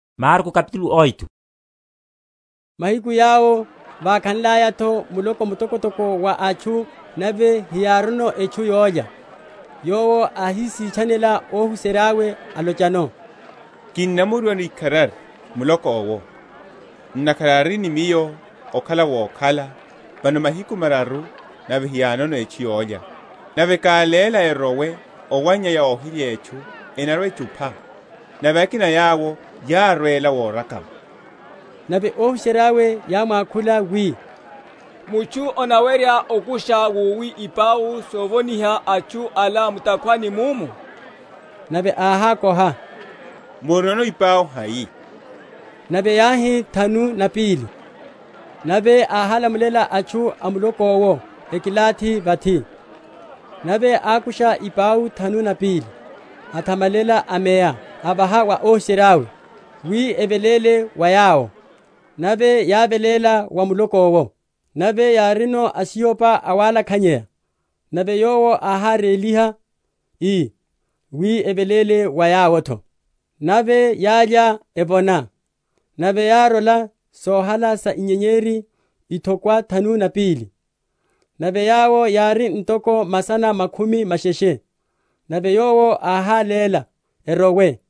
Wachererya ipau. Mahiku yawo vákhanlaya’tho muloko mtokotoko wa atchu, nave heyárino etchu yólya, Yowo áhisitchanela óhuserya’we, alochano, Kinnamoriwano ikharari muloko’wo, ntakhara ari ni Miyo okhala wokhala vano mahiku mararu nave hayinono etchu yólya; nave káléla erowe owannyaya óhilya etchu, enarwa‐echupha; nave akina a yawo yárwela worekama. Nave óhuserya’we yámwakhula wi, Mutchu anawerya okusha wowi ipau sovoniha atchu ala mu’takhwani muno? Nave áhákoha, Murinono ipau hai? Nave yáhi, Thanu na pili. Nave áhálamulela atchu a muloko’wo ekilathi vathi; nave ákusha ipau thanu na pili’ho, athamalela, ameya, avaha wa óhuserya’we, wi eveléle wa yawo; nave yáveléla wa muloko’wo. Nave yárino asihopa awalakhanyeya; nave Yowo áháréliha, ii, wi eveléle wa yawo’tho. Nave yálya evona, nave yárola sohala sa inyenyeri ithokwa thanu na pili. Nave yawo yári ntoko masana makhumi masheshe; nave Yowo áháléla erowe.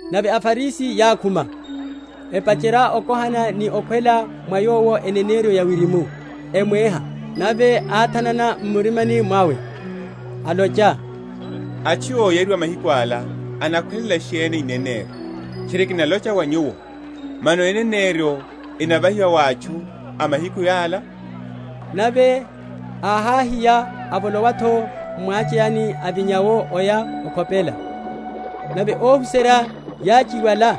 Nave aFarisi yákhuma, epacherya okohanano ni okhwela mwa Yowo eneneryo ya wirimu, emwéha. Nave áthanana m’murimani mwawe, alocha, Atchu óyariwa mahiku ala enakhwelela sheni eneneryo? Tchiri, kinalocha wa nyuwo, mano eneneryo enavahiwa wa atchu a mahiku ala? Nave áháhiya, avolowa’tho m’mwacheyani, avinya’wo oya okhopela. Nave óhuserya yáchiwala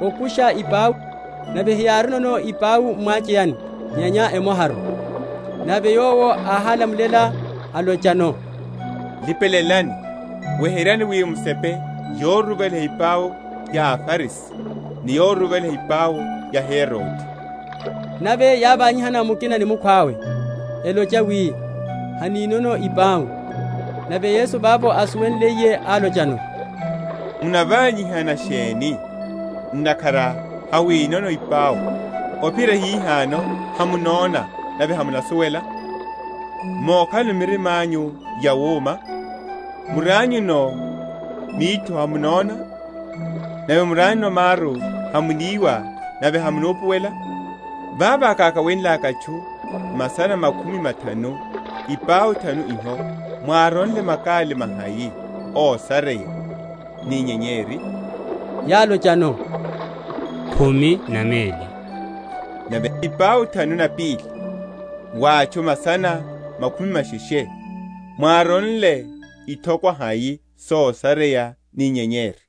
okusha ipau, nave heyárinono ipau m’mwacheyani nyenya emoharu. Nave Yowo áhálamulela, alochano, Lipelelani, weheryani wi musepe yoruruvaliha ipau ya aFarisi ni yoruruvaliha ipau ya Herode. Nave yávanyihana mukina ni mukhwawe, elocha wi, Haninono ipau. Nave Yesu vavo ásuwenliye, álochano, Munavanyihana sheni, ntakhara hamwinono ipau? ophiyerya hihano hamunona nave hamunasuwela? Mokhalano mirima’nyu yawuma? Murianyuno mitho hamunona? nave murianyuno maru hamuniwa nave hamunupuwela? Vavo kákawenlaka atchu masana makhumi mathanu ipau thanu iho mwáronle makali mahai ósareya ni inyenyeri? Yálochano, Khumi na meli. Nave ipau thanu na pili wa atchu masana makhumi masheshe, mwáronle ithokwa hai sosareya ni inyenyeri?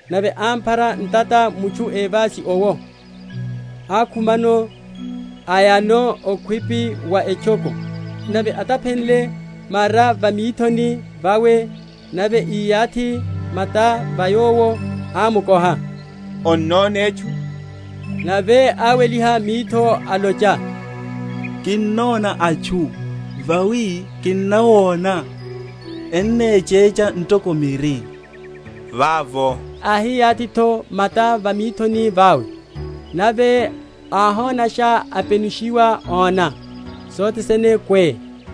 Nave ámphara ntata mutchu évasi owo, akhumano, ayano okhwipi wa etchoko; nave ataphenle mara va mithoni vawe, nave íyanthe mata va yowo, ámukoha, Onnona etchu? Nave áweliha mitho, alocha, Kinnona atchu; vawi kinnawona ennechecha ntoko miri. Vavo áhiyathi’tho mata va mithoni vawe; nave áhonasha, apenushiwa, óna sothe sene kwé.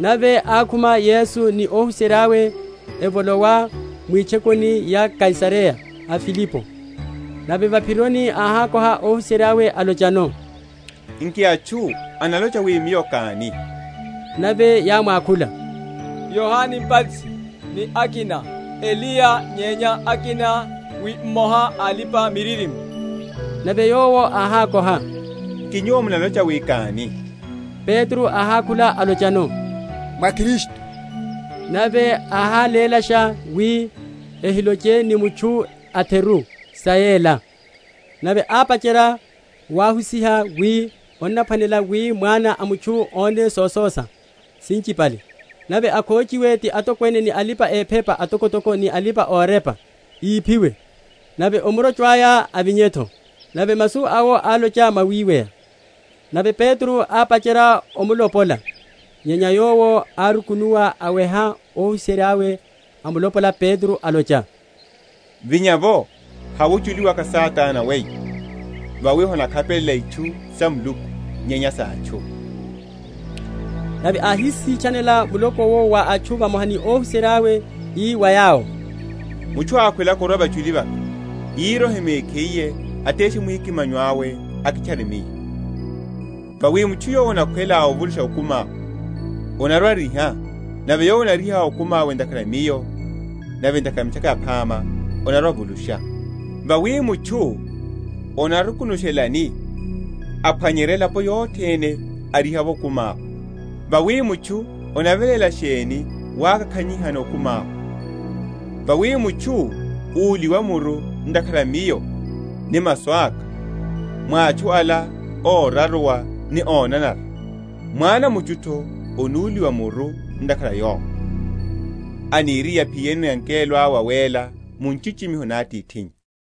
Nave ákhuma Yesu ni óhuserya’we, evolowa mwitchokoni sa Kaisareya a Filipi; nave va’phironi áhákoha óhuserya’we, alochano, Nki atchu enalocha wi Miyo káni? Nave yámwakhula, Yohane Mbatisi, ni akina, Eliya; nyenya akina, wi mmoha a alipa‐miririmo. Nave Yowo áhákoha, Nki nyuwo munalocha wi káni? Petro áhákhula, alochano, Mwá Kristu. Nave áhálélasha wi ehiloche ni mutchu a’theru sa yela. Nave ápacherya wahusiha wi, Onaphwanela wi Mwana a mutchu óne sososa sinchipale, nave akhochiwe ti atokwene ni alipa‐ephepa atokotoko ni alipa‐orepa, íphiwe, nave omurocho aya avinye’tho. Nave masu awo álocha mwawiweya. Nave Petro ápacherya omulopola. Nyenya Yowo árukunuwa, aweha óhuserya’we, amulopola Petro, alocha, Vinya’vo, hawe ochuli waka, Satana weyo; vawi hamunakhapelela itchu sa Muluku, nyenya sa atchu. Otesha mwikimanyo. Nave áhisitchanela muloko’wo wa atchu vamoha ni óhuserya’we ii wa yawo, Mutchu ákhwelaka orwa vachuli vaka, írohe mekhiye, ateshe mwikimanyo awe, akitchare Miyo. Vawi mutchu yowo anakhwela ovulusha okumi awe, anarwa‐ariha; nave yowo anariha okumi awe ntakhara a Miyo nave ntakhara a Mitchaka Yaphama, anarwa‐avulusha. Vawi mutchu anarukunushelani aphwanyerya elapo yothene, ariha’vo okumi awe? Vawi mutchu anaveléla sheni wakakhanyihano okumi awe? Vawi mutchu úliwa‐muru ntakhara a Miyo ni a masu aka mwa atchu ala óraruwa ni ónanara, Mwana a mutchu’tho anúliwa‐muru ntakhara a yowo, aniriye aphiyeno angelo awe awéla, mu nchichimiho na Atithinnya.